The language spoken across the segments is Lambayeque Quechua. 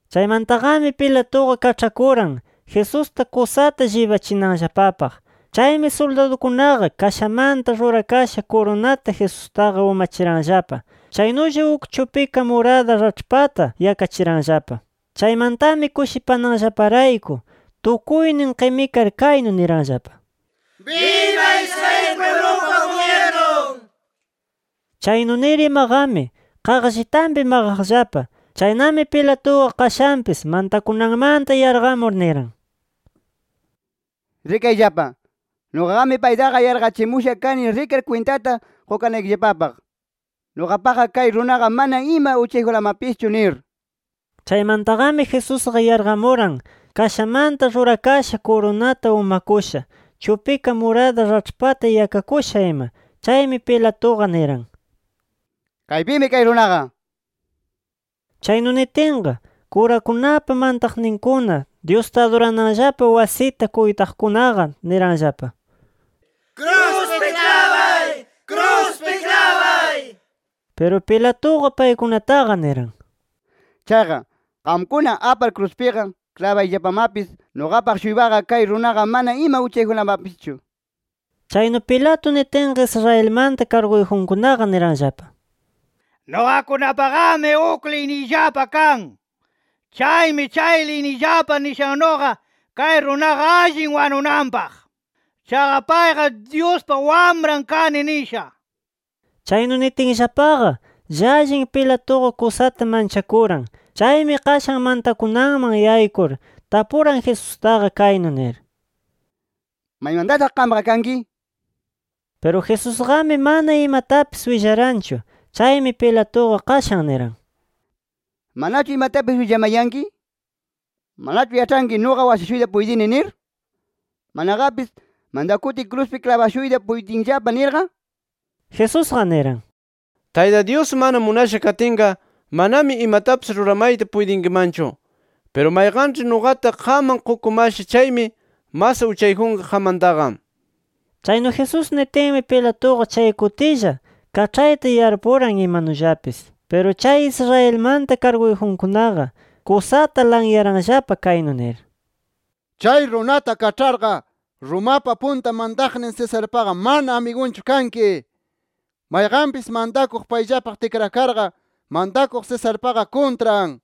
Chaymantaqami, Pilatuqa kaĉhakuran, Jesusta kusata llibachinanllapapaq. Chaymi suldadukunaqa kashamanta rurakasha kurunata Jesustaqa umachiranllapa. Chaynulla uk chupika murada raĉhpata yakachiranllapa. Chaymantami kushipananllaparayku tukuynin qimikar kaynu niranllapa: —¡Biba Israel pwiblupa gubyirnun! nir. Chaynu nir imaqami, qaqllitanpi maqaqllapa. Chaynami, Pilatuqa qashanpis mantakunanmanta yarqamur niran: —Rikayllapa. Nuqaqami paytaqa yarqachimusha kani rikar kwintata qukanaykillapapaq, nuqapaqqa kay runaqa mana ima uchayjunlamapischu nir. Chaymantaqami Jesusqa yarqamuran, kashamanta rurakasha kurunata umakusha, chupika murada raĉhpata yakakusha ima. Chaymi Pilatuqa niran: —¡Kaypimi kay runaqa! nir. Chaynu nitinqa, kurakunapa mantaqninkuna, Dyusta adurananllapa wasita kuytaqkunaqa niranllapa: —¡Kruspi klabay! ¡Kruspi klabay! nir. Piru Pilatuqa paykunataqa niran: —Chaqa, qamkuna apar kruspiqa klabayllapamapis. Nuqapaq-shuypaqa, kay runaqa mana ima uchayjunlamapischu nir. Chaynu Pilato nitinqa, Israelmanta karguyjunkunaqa niranllapa: —Nuqakunapaqami uk liyniyllapa kan. Chaymi, chay liyniyllapa nishannuqa, kay runaqa allin wanunanpaq. Chaqa payqa ‘Dyuspa Wamran kani’ nisha. Chaynu nitinllapaqa llallin Pilatuqa kusata manchakuran. Chaymi qashan mantakunanman yaykur, tapuran Jesustaqa kaynu nir: —¿Maymantataq qamqa kanki? nir. Piru Jesusqami, mana imatapis willaranchu. Chaymi Pilatuqa qashan niran: —¿Manachu imatapis willamayanki? ¿Manachu yaĉhanki, nuqa washashuyta puytini? nir. Manaqapis ¿mantakutiy kruspi klabashuyta puytinllapa nirqa? Jesusqa niran: —Tayta Dyus, mana munasha katinqa, manami imatapis ruramayta puytinkimanchu. Piru mayqanĉhi nuqata qamman qukumasha chaymi mas uchayjunqa qammantaqa. Chaynu Jesús nitinmi, Pilatuqa chay kutilla kaĉhayta yarpuran imanullapis. Piru chay Israelmanta karguyjunkunaqa kusata lanyaranllapa, kaynu nir: —¡Chay runata kaĉharqa, Romapa punta mantaqnin Cesarpaqa mana amigunchu kanki! ¡Mayqanpis mantakuq paylla tikrakarqa, mantakuq Cesarpaqa kuntran! nir.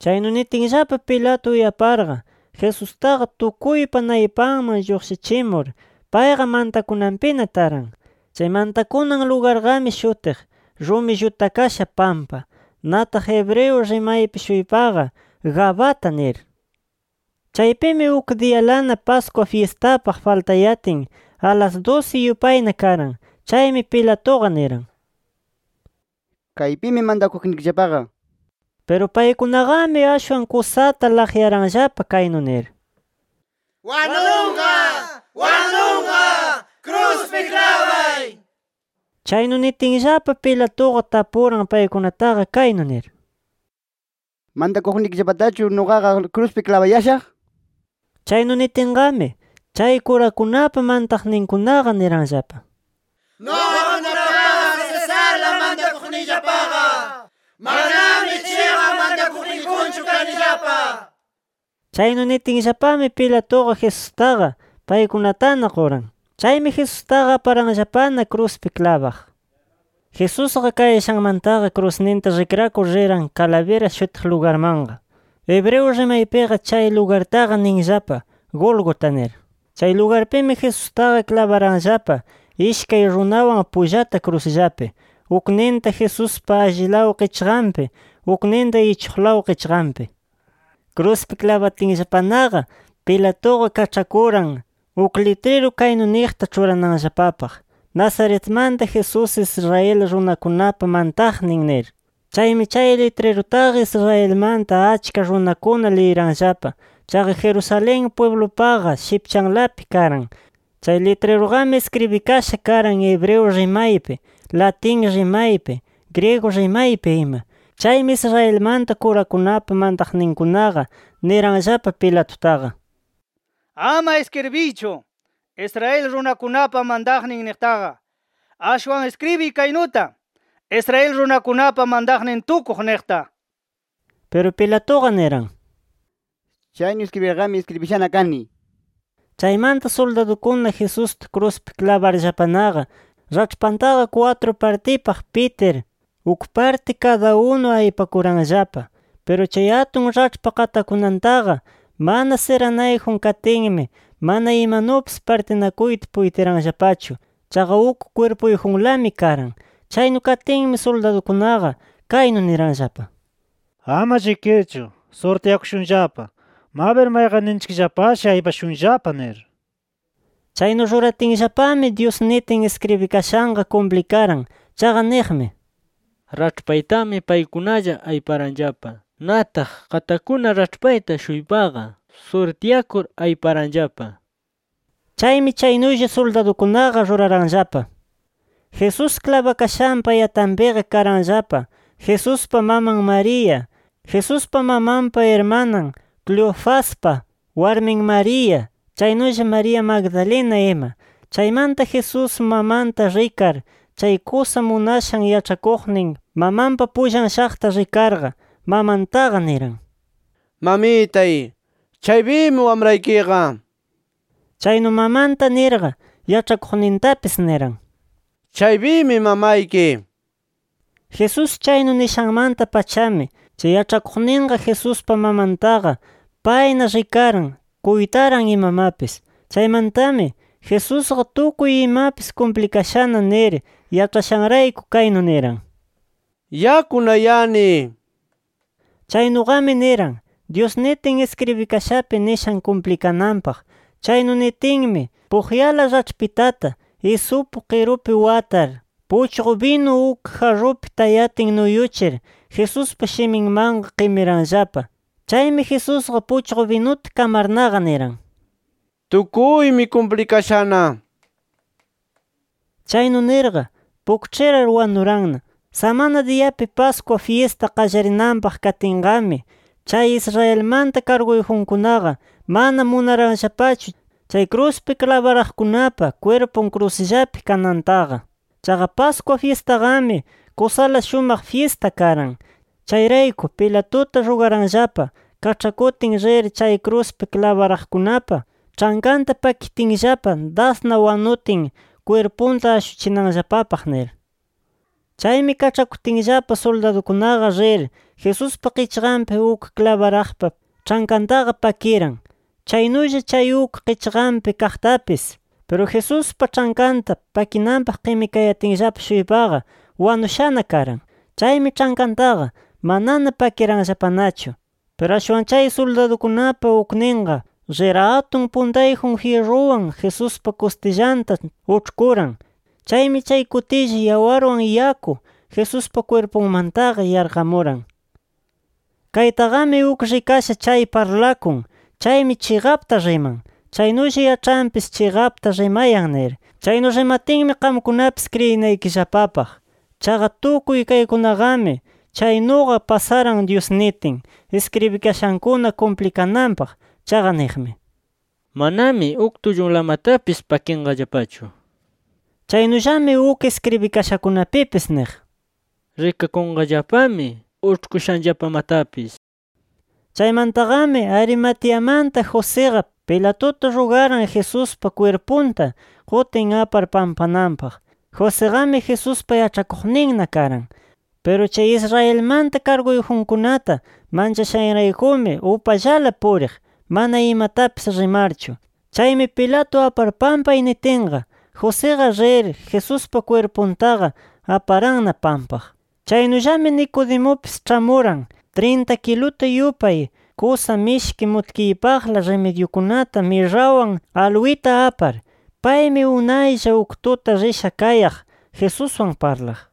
Chaynu nitinllapa Pilato uyaparqa, Jesustaqa tukuypa naypanman lluqshichimur, payqa mantakunanpina taran. Chay mantakunan lugarqami shutiq “Rumi Llutakasha Pampa”. Nataq hebreo rimaypi-shuypaqa “Gabata” nir. Chaypimi uk diyalana Pascua fyistapaq faltayatin, alas dusi yupayna karan. Chaymi Pilatuqa niran: —¡Kaypimi mantakuqnikillapaqa! nir. Piru paykunaqami ashwan kusata laqyaranllapa kaynu nir: —¡Wanunqa! ¡Wanunqa! ¡Kruspi klabay! nir ima. Chaynu nitinllapa, Pilatuqa tapuran paykunataqa kaynu nir: —¿Mantakuqnikillapatachu nuqaqa kruspi klabayashaq? Chaynu nitinqami, chay kurakunapa mantaqninkunaqa niranllapa: —¡Nuqakunapaqa, Cesarla mantakuqniyllapaqa! ¡Manami chiqan mantakuqniyjunchu kanillapa! nir. Chaynu nitinllapami, Pilatuqa Jesustaqa paykunatana quran. Chaymi Jesustaqa aparanllapana kruspi klabaq. Jesusqa kayashanmantaqa krusninta rikrakur riran, Calavera shutiq lugarmanqa. (Hebreo rimaypiqa chay lugartaqa ninllapa Gólgota nir.) Chay lugarpimi Jesustaqa klabaranllapa ishkay runawan pullata krusllapi, ukninta Jesuspa allilaw qichqanpi, ukninta ichuqlaw qichqanpi. Kruspi klabatinllapanaqa Pilatuqa kaĉhakuran, uk litriru kaynu niqta ĉhurananllapapaq: “NAZARETMANTA JESÚS, ISRAEL RUNAKUNAPA MANTAQNIN” nir. Chaymi chay litrirutaqa Israelmanta achka runakuna liyiranllapa. Chaqa Jerusalén pwiblupaqa shipchanlapi karan. Chay litriruqami iskribikasha karan hebreo rimaypi, latin rimaypi, griego rimaypi ima. Chaymi Israelmanta kurakunapa mantaqninkunaqa niranllapa Pilatutaqa. —Ama iskribiychu ‘Israel runakunapa mantaqnin’ niqtaqa. Ashwan iskribiy kaynuta: ‘Israel runakunapa mantaqnin tukuq’ niqta. Piru Pilatuqa niran: —¡Chaynu iskribirqami, iskribishana kani! nir. Chaymanta suldadukuna Jesusta kruspi klabarllapanaqa raĉhpantaqa kwatru partipaq pitir, uk parti kada unu aypakuranllapa. Piru chay atun raĉhpa qatakunantaqa mana siranayjun katinmi, mana imanupis partinakuyta puytiranllapachu. Chaqa uk kwirpuyjunlami karan. Chaynu katinmi suldadukunaqa, kaynu niranllapa: —Ama llikirchu surtyakushunllapa, mabir mayqanninchikllapashi aypashunllapa nir. Chaynu ruratinllapami Dyus nitin iskribikashanqa kumplikaran. Chaqa niqmi: “Raĉhpaytami paykunalla ayparanllapa. Nataq qatakuna raĉhpayta-shuypaqa surtyakur ayparanllapa” nir. Chaymi chaynulla suldadukunaqa ruraranllapa. Jesús klabakashanpa yatanpiqa karanllapa Jesuspa maman María, Jesuspa mamanpa irmanan, Cleofaspa warmin María, chaynulla María Magdalena ima. Chaymanta Jesús mamanta rikar, chay kusa munashan yaĉhakuqnin mamanpa pullan shaqta rikarqa, mamantaqa niran: —Mamitay, chaypimi wamraykiqa nir. Chaynu mamanta nirqa, yaĉhakuqnintapis niran: —Chaypimi mamayki nir. Jesús chaynu nishanmanta-pachami, chay yaĉhakuqninqa Jesuspa mamantaqa payna rikaran, kuytaran imamapis. Chaymantami, Jesusqa tukuy imapis kumplikashana nir yaĉhashanrayku kaynu niran: —Yakunayani nir. Chaynuqami niran, Dyus nitin iskribikashapi nishan kumplikananpaq. Chaynu nitinmi, puqyala raĉhpitata isupu qirupi watar, puchqu binu uk jarrupi tayatin nuyuchir, Jesuspa shiminmanqa qimiranllapa. Chaymi Jesusqa puchqu binuta kamarnaqa niran: —Tukuymi kumplikashana nir. Chaynu nirqa, pukĉhirar wanuranna. Samana diyapi Pascua fyista qallarinanpaq katinqami, chay Israelmanta karguyjunkunaqa mana munaranllapachu, chay kruspi klabaraqkunapa kwirpun krusllapi kanantaqa. Chaqa Pascua fyistaqami kusala shumaq fyista karan. Chayrayku Pilatuta rugaranllapa kaĉhakutin rir chay kruspi klabaraqkunapa ĉhankanta pakitinllapa dasna wanutin, kwirpunta ashuchinanllapapaq nir. Chaymi kaĉhakutinllapa, suldadukunaqa rir, Jesuspa qichqanpi uk klabaraqpa ĉhankantaqa pakiran. Chaynulla chay uk qichqanpi kaqpatapis. Piru Jesuspa ĉhankanta pakinanpaq qimikayatinllapa-shuypaqa, wanushana karan. Chaymi ĉhankantaqa manana pakiranllapanachu. Piru ashwan chay suldadukunapa ukninqa rir atun puntayjun jyirruwan Jesuspa kustillanta uĉhkuran. Chaymi chay kutilla, yawarwan yaku Jesuspa kwirpunmantaqa yarqamuran. Kaytaqami uk rikasha chay parlakun. Chaymi chiqapta riman. Chaynulla yaĉhanpis chiqapta rimayan nir. Chaynu rimatinmi, qamkunapis kriyinaykillapapaq. Chaqa tukuy kaykunaqami chaynuqa pasaran Dyus nitin iskribikashankuna kumplikananpaq. Chaqa niqmi: “Manami uk tullunlamatapis pakinqallapachu” nir. Chaynullami uk iskribikashakunapipis niq: “Rikakunqallapami uĉhkushanllapamatapis” nir. Chaymantaqami Arimateamanta Josiqa, Pilatuta rugaran Jesuspa kwirpunta qutin apar pampananpaq. Josiqami, Jesuspa yaĉhakuqninna karan. Piru chay Israelmanta karguyjunkunata manchashanraykumi, upallala puriq, mana imatapis rimarchu. Chaymi Pilato apar pampay nitinqa, Josiqa rir, Jesuspa kwirpuntaqa aparanna pampaq. Chaynullami Nicodemupis ĉhamuran, trinta kiluta yupay kusa mishki mutkiypaqla rimidyitukuna mirrawan, aluwita apar. Paymi unaylla uk tuta risha kayaq Jesuswan parlaq.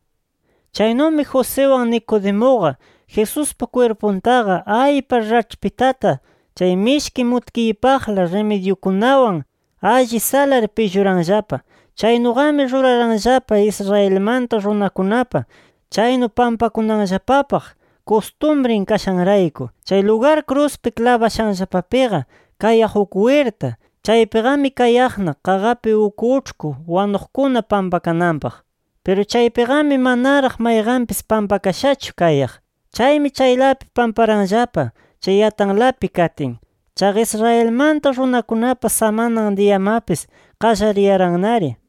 Chaynumi, Josiwan Nicodemuqa Jesuspa kwirpuntaqa aypar, raĉhpitata chay mishki mutkiypaqla rimidyitukunawan alli salar, pilluranllapa. Chaynuqami ruraranllapa, Israelmanta runakunapa chaynu pampakunanllapapaq kustumrin kashanrayku. Chay lugar kruspi klabashanllapapiqa kayaq uk wirta. Chaypiqami kayaqna qaqapi uk uĉhku wanuqkuna pampakananpaq. Piru chaypiqami manaraq mayqanpis pampakashachu kayaq. Chaymi chaylapi pamparanllapa, chay yatanlapi katin. Chaqa Israelmanta runakunapa samanan diyamapis qallariyarannari.